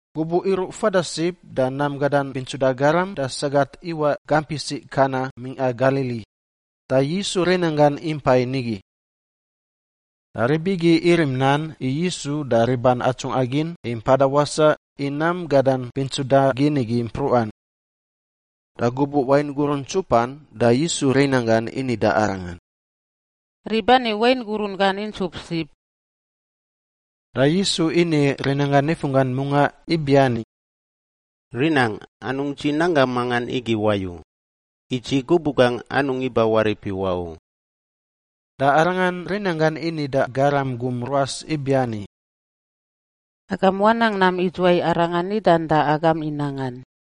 Gubuꞌ iruꞌ fada sib da nam gadan bintsuda garam da sagat iwaꞌ gamp isiꞌ Kana mingꞌa Galili, da Yisu rinanggan impa nigi. Da rib igi irim nan i Yisu da riban atsungꞌa gin i mpada wasaꞌ i nam gadan bintsuda gin igi mpruꞌan. Da gubuꞌ wain gurun ntsupan da Yisu rinanggan ini da Arangan, “Rib ani wain gurun gan intsup sib.” Da Yisu ini rinanggan nifunggan mungaꞌ ibiani, “Rinangꞌ, anungꞌ dzi nanggangꞌ mangan igi wayu. I dzi gubuꞌ gangꞌ anungꞌ iba warip iwaꞌ u.” Da Arangan rinanggan ini da garam gum ruas igi ibiani, “Agam wanang nam idzuwai arangan nidan da agam i nangan.”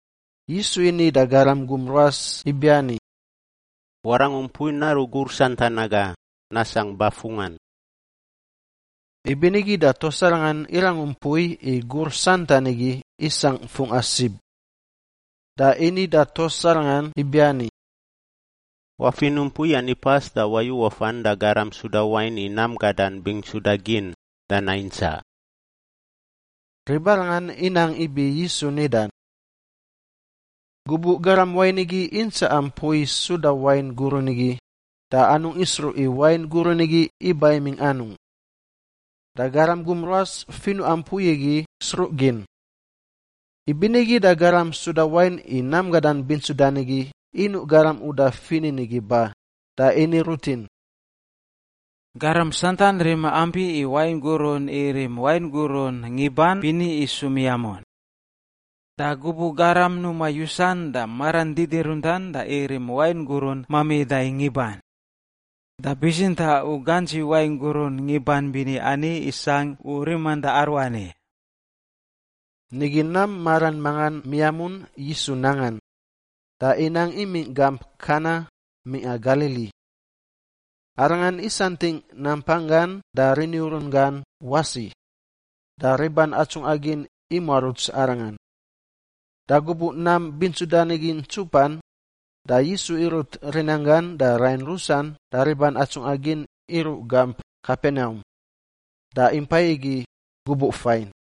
Yisu ini da garam gum ruas ibiani, “Warangu mpui naruꞌ gur santan aga nasangꞌ bafungꞌan.” Ibinigi da tuas arangan irangu mpui i gur santan igi isangꞌ fungꞌa sib. Da ini da tuas arangan ibiani, “Wafinuꞌ mpui ani pas da wayu wafan da garam suda wain i nam gadan bintsuda gin da naintsaꞌ.” Ribarangan inang ibi Yisu nidan. Gubuꞌ garam wain igi intsaꞌa mpui suda wain gurun igi da anungꞌ isruꞌ i wain gurun igi iba imingꞌ anungꞌ. (Da garam gum ruas finuꞌa mpui igi sruꞌ gin.) Ibinigi da garam suda wain i nam gadan bintsudan igi inuꞌ garam uda finin igi ba da ini rutin, “Garam santan rima ampi i wain gurun irim wain gurun ngiban bini isu miamun. Da gubuꞌ garam numa yusan da maran didiruntan da irim wain gurun mamida i ngiban. Da bitsintaꞌ u gantsi wain gurun ngiban bini ani isangꞌ u riman da aruani.” Nigi nam maran mangan miamun Yisu nangan, da inang imingꞌ gamp Kana mingꞌa Galili. Arangan isantingꞌ nampanggan da riniurun gan wasi, da riban atsungꞌa gin imuaruts Arangan. Da gubuꞌ nam bintsudan igi ntsupan da Yisu irut rinanggan da rain rusan da riban atsungꞌa gin iruꞌ gamp Kapenaum, da impai igi gubuꞌ fain.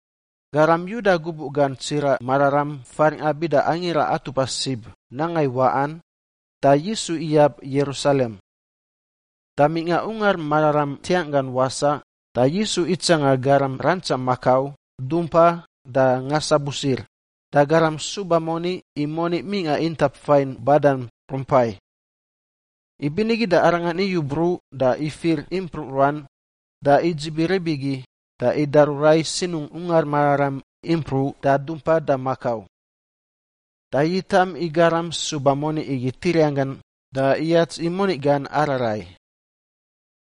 Garam Yuda gubuꞌ gan tsiraꞌ mararam faringꞌa bida Angira Atupa Sib nanga i waꞌan, da Yisu iyab Yerusalem. Da mingꞌa Ungar Mararam ntiangꞌ gan wasaꞌ da Yisu itsanga garam rantsa makau, dumpa, da ngasabusir, da garam suba moni i moni mingꞌa intap fain badan rumpai. Ibinigi da Arangan iyu bruꞌ da ifir impruꞌ ruan da idzibi rib igi da idaru rai sinungꞌ Ungar Mararam impruꞌ da dumpa da makau. Da yitam i garam suba moni igi tiriang gan da iyats i moni gan ararai.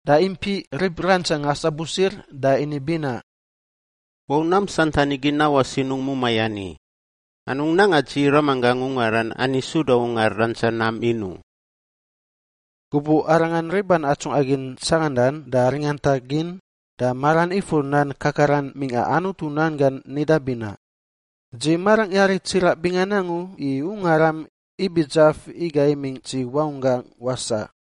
Da impiꞌ rib rantsa ngasabusir da ini binaꞌ, “Wau nam santan igi nawaꞌ sinungꞌ mumai ani! Anungꞌ nanga dzi Ramanggangꞌ ungaran ani suda ungar rantsa nam in u!” Gubuꞌ Arangan riban atsungꞌa gin tsangandan da ringantagin da maran ifur nan kakaran mingꞌa Anutu nan gan nida binaꞌ, “Dzi marangꞌ yari tsiraꞌ bingan angu i ungaram ibi dzaf iga imingꞌ dzi wangunggaꞌ wasaꞌ.”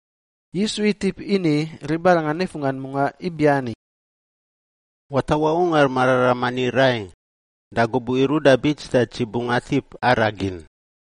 Yisu itip ini ribarangan nifunggan mungaꞌ ibiani, “Watawaꞌ ungar mararam ani rai, da gubuꞌ iruꞌ da bits da dzi bungꞌ atip araꞌ gin.”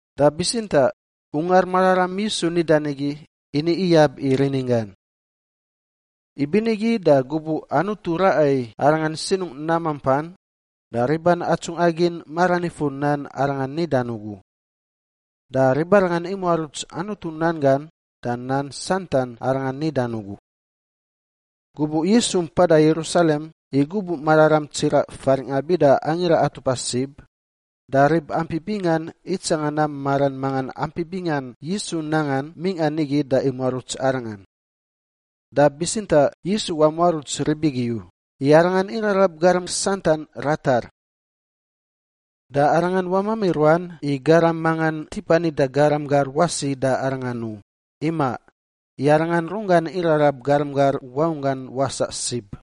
Da bitsintaꞌ ungar mararam Yisu nidan igi ini iyab i rininggan. Ibinigi da gubuꞌ Anutu raꞌa i Arangan sinungꞌ nam mampan, da riban atsungꞌa gin maran ifur nan Arangan nidan ugu. Da ribarangan imuaruts Anutu nan gan da nan santan Arangan nidan ugu. Gubuꞌ Yisu mpada Yerusalem i gubuꞌ mararam tsiraꞌ faringꞌa bida Angira Atupa Sib, da rib ampi bingan itsanga nam maran mangan ampi bingan Yisu nangan mingꞌa nigi da imuaruts Arangan. Da bitsintaꞌ Yisu wamuaruts rib igi u, i Arangan irarab garam santan ratar. Da Arangan wamami ruan i garam mangan tipa nida garam gar wasi da Arangan u, imaꞌ, i Arangan runggan irarab garam gar wangunggan wasaꞌ sib.